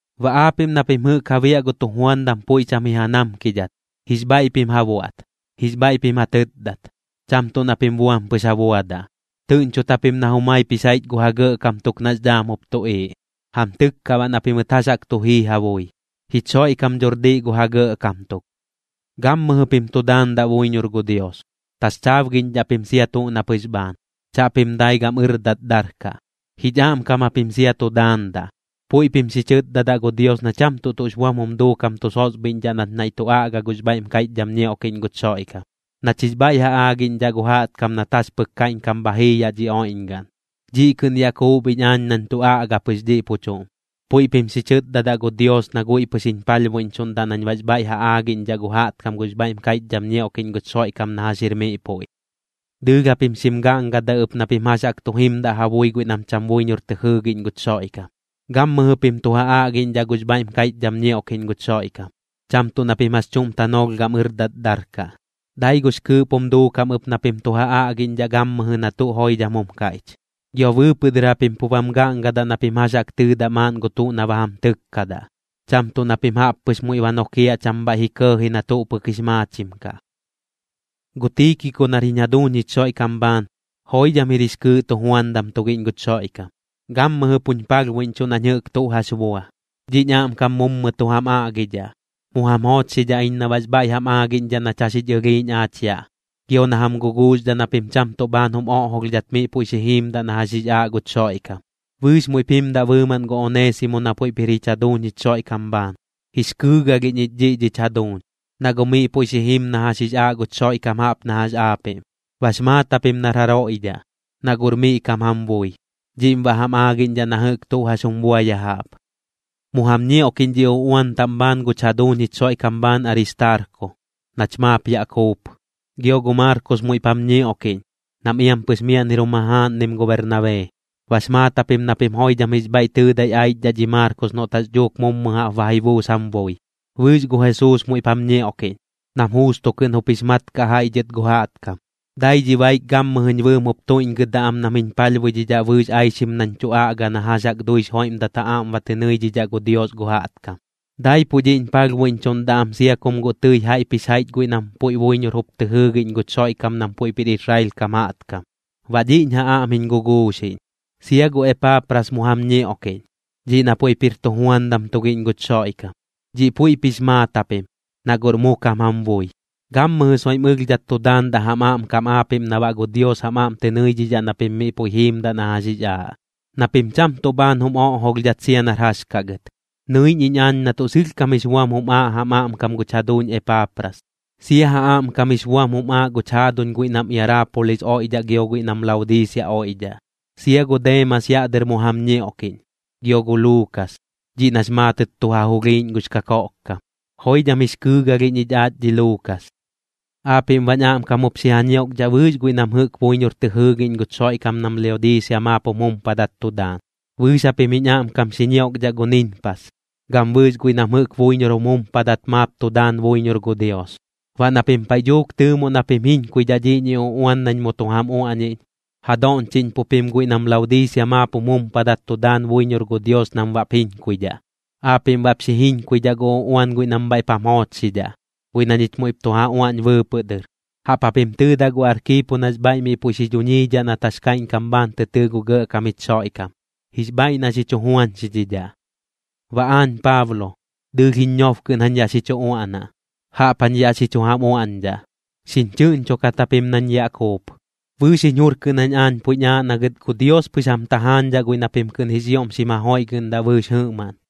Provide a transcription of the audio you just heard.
Baꞌ aapiꞌm na pim jɨꞌk ja biaꞌ gu tujuandam puiꞌ cham ji ja namkidhat, jix bhaiꞌ pim ja buaꞌt, jix bhaiꞌ pim ja tɨtdat, cham tuꞌ na pim buam pɨx ja buadaꞌ. Tɨꞌñchot japim na jumaip jix jaiꞌch gu ja gɇꞌkam tuk nax dhaam jup tuꞌiiꞌ, jam tɨkkaꞌ baꞌ na pimɨt jax jaꞌk tu jii ja bui. Jich Xoiꞌkam dhor diꞌ gu ja gɇꞌkam tuk. Gammɨjɨ pim tu daandaꞌ buiñor gu Dios, taxchaabgiꞌñdhaꞌ pim sia tuꞌ na pɨx bhaan, chaꞌpim dai gam ɨrdat darkaꞌ. Jich aꞌmkam japim sia tu daandaꞌ, puiꞌ pim xi chɨtdadaꞌ gu Dios na cham tuꞌ tuꞌx buam jum duukam tu sosbhiꞌñdhaꞌ nach naiꞌ tu aꞌga gux bhaiꞌm kaiꞌchdham ñioꞌkiꞌñ guch Xoiꞌkam, nach jix bhaiꞌ ja aagiꞌñdhaꞌ gu jaꞌtkam nat jax pɨk kaiꞌñkam bha jii yaꞌ dhi oiꞌñgaꞌn. Dhiꞌ kɨꞌn yaꞌ kuup iñ aañ nañ tu aꞌga pɨx dhiꞌ pu chuꞌm. Puiꞌ pim xi chɨtdadaꞌ gu Dios na guiꞌ pɨx jiñ palhbuiꞌñchuꞌndaꞌ nañ baꞌx bhaiꞌ ja aaꞌñdhidhaꞌ gu jaꞌtkam gux bhaiꞌm kaiꞌchdham ñioꞌkiꞌñ guch Xoiꞌkam na jax jir miꞌ puiꞌ. Dɨɨlh japim xim gaꞌngadaꞌ ɨp na pim jax jaꞌk tu jimdaꞌ ja bui guiꞌ nam cham buiñor tɨ jɨɨgiꞌñ guch Xoiꞌkam. Gammɨjɨ pim tu ja aꞌgiꞌñdhaꞌ gux bhaiꞌm kaiꞌchdham ñioꞌkiꞌñ guch Xoiꞌkam, cham tuꞌ na pim jax chuꞌm tanoolh gam ɨrdat darkaꞌ. Dai gux kɨɨꞌp jum duukam ɨp na pim tu ja aꞌgiꞌñdhaꞌ gammɨjɨ na tuꞌ joidham jum kaiꞌch. Gio bɨɨpɨꞌ dɨr japim pu bam gaꞌngadaꞌ na pim jax jaꞌk tɨɨdaꞌ maaꞌn gu tuꞌ na ba jam tɨkkadaꞌ, cham tuꞌ na pim jaꞌp pɨx muiꞌ ba nokiaꞌ cham bhaiꞌ ji kɇɇji na tuꞌ pɨk jix maachim kaꞌ. Gu Tiikiko nar jich jaduuñ jich Xoiꞌkam bhaan, joidham jir jix kɨɨꞌ tujuandam tugiꞌñ guch Xoiꞌkam, gammɨjɨ puñ palhbuiꞌñchuꞌ nañ jɨꞌk tuꞌ jax bua. Dhiꞌñ aꞌmkam mummɨ tu jam aꞌgidhaꞌ. Mu jam joochxidhaꞌ iñ na baꞌx bhaiꞌ jam aagiꞌñdhaꞌ nach jax jich ɨlhiiꞌñ aach yaꞌ, gio na jam guguuxdhaꞌ na pim cham tuꞌ bhaan jum oꞌjolhdhat miꞌ puiꞌ xi jiimdaꞌ na jax jix aaꞌ guch Xoiꞌkam. Bɨɨx muiꞌp jimdaꞌ bɨɨmaꞌn gu Oneesimo na puiꞌp jir jich jaduuñ jich Xoiꞌkam bhaan. Jix kɨɨgalhiꞌñ ich dhiꞌ dhich jaduuñ, na guꞌ miꞌ puiꞌ xi jim na jax jix aaꞌ guch Xoiꞌkam jaꞌp na jax aapiꞌm. Bax maat japim nar jaroiꞌ dhaꞌ, na guꞌr miꞌ kam jam bui. Dhiꞌm baꞌ jam aagiꞌñdhaꞌ na jɨꞌk tuꞌ jax jum bua ya jaꞌp. Mu jam ñioꞌkiꞌñ dhi uꞌuan taꞌm bhaan guñ jaduuñ jich Xoiꞌkam bhaan Aristaarko, nach maap yaꞌ kuup. Gio gu Maarkos puiꞌ muiꞌp jam ñioꞌkiꞌñ, nam iampɨx miaꞌn jir jum jajaaꞌnim gu Bernabee. Bax maat japim na pim joidham jix bhaiꞌ tɨɨdai aichdhaꞌ dhi Maarkos noꞌt jax dhuuk mummɨ jaꞌp ba ji buus jam bui. Bɨɨx gu Jesuus muiꞌp jam ñioꞌkiꞌñ, nam Juusto kɨꞌn jup jix maat kaꞌ jaiꞌ dhɨt gu jaꞌtkam. Dai dhi baik gammɨjɨñ bɨɨm jup tuiꞌñgɨdaꞌ am nam jiñ palhbuidhidhaꞌ bɨɨx aixim nañ tu aꞌga na jax jaꞌk duix joiꞌmdat ja aꞌm ba tɨ nɨidhidhaꞌ gu Dios gu jaꞌtkam. Daipuꞌ dhiꞌñ palhbuiꞌñchuꞌndaꞌ am sia kum guꞌ tɨi jaiꞌp jix jaiꞌch guiꞌ nam puiꞌ buiñor jup tɨ jɨɨgiꞌñ guch Xoiꞌkam nam puiꞌp jir Israel kam jaꞌtkam. Baꞌ dhiꞌñ ja aꞌm jiñ guguuxiꞌñ. Sia gu Epaapras mu jam ñioꞌkiꞌñ, dhiꞌ na puiꞌp jir tujuandam tugiꞌñ guch Xoiꞌkam. Dhiꞌ puiꞌp jix maat japim, na guꞌr mu kam jam bui. Gammɨjɨ soiꞌm ɨlhdhat tu daandaꞌ jam aꞌmkam aapiꞌm na baꞌ gu Dios jam aꞌm tɨ nɨidhidhaꞌ na pim miꞌ puiꞌ jiimdaꞌ na jax jix aaꞌ, na pim cham tuꞌ bhaan jum oꞌjolhdhat sia nar jax kaꞌ gɨt. Nɨiꞌñ iñ aañ na tuꞌ sɨlhkam jix buam jum aaꞌ jam aꞌmkam guch jaduuñ Epaapras, sia ja aꞌmkam jix buam jum aaꞌ guch jaaduñ guiꞌ nam Iaraapolis oiꞌdhaꞌ gio guiꞌ nam Laodiisia oiꞌdhaꞌ. Sia gu Deemas yaꞌ dɨr mu jam ñioꞌkiꞌñ, gio gu Luukas, dhiꞌ nax maatɨt tu ja julhiiꞌñ gux kakoꞌkkam. Joidham jix kɨɨgalhiꞌñ ich aach dhi Luukas. Aapiꞌm baꞌñ aꞌmkam jup xi ja ñioꞌkdhaꞌ bɨɨx guiꞌ nam jɨꞌk buiñor tɨ jɨɨgiꞌñ guch Xoiꞌkam nam Laodiisia maap jum jumpadat tu daan. Bɨɨx japim jiñ aꞌmkam xi ñioꞌkdhaꞌ gu Ninpas, gam bɨɨx guiꞌ nam jɨꞌk buiñor jum jumpadat maap tu daan buiñor gu Dios. Baꞌ na pim paiꞌ dhuuk tɨɨmoꞌ na pim jiñkuidhaꞌ dhiꞌñi uꞌuan nañ mu tu jam uaꞌniꞌñ, ja doꞌñchiꞌñpuꞌ pim guiꞌ nam Laodiisia maap jum jumpadat tu daan buiñor gu Dios nam baꞌp jiñkuidhaꞌ. Aapiꞌm baꞌp xi jiñkuidhaꞌ gu uꞌuan guiꞌ nam bhaiꞌp jam joochxidhaꞌ, guiꞌ na ñich muiꞌp tu ja uaꞌñ bɨɨpɨꞌ dɨr. Jaꞌp japim tɨɨdaꞌ gu Arkiipo nax bhaiꞌ miꞌ puiꞌ xi dhuñiidhaꞌ nat jax kaiꞌñkam bhaan tɨ tɨɨ gu Gɇꞌkam jich Xoiꞌkam, jix bhaiꞌ na xi chu juañxidhidhaꞌ. Baꞌ aañ Paablo, dɨɨlh jiñ ñob kɨꞌn jañ yaꞌ xi chu uaꞌnaꞌ, jaꞌp jañ yaꞌ xi chu jam uaꞌñdhaꞌ. Xiñ chɨꞌñchokat japim nañ yaꞌ kuup. Bɨɨx jiñ jur kɨꞌn jañ aañ puiꞌñ aaꞌ na gɨt gu Dios pɨx jam tajaañdhaꞌ guiꞌ na pim kɨꞌn jix ioꞌm xim jajoiꞌgɨꞌndaꞌ bɨɨx jɨꞌmaꞌn.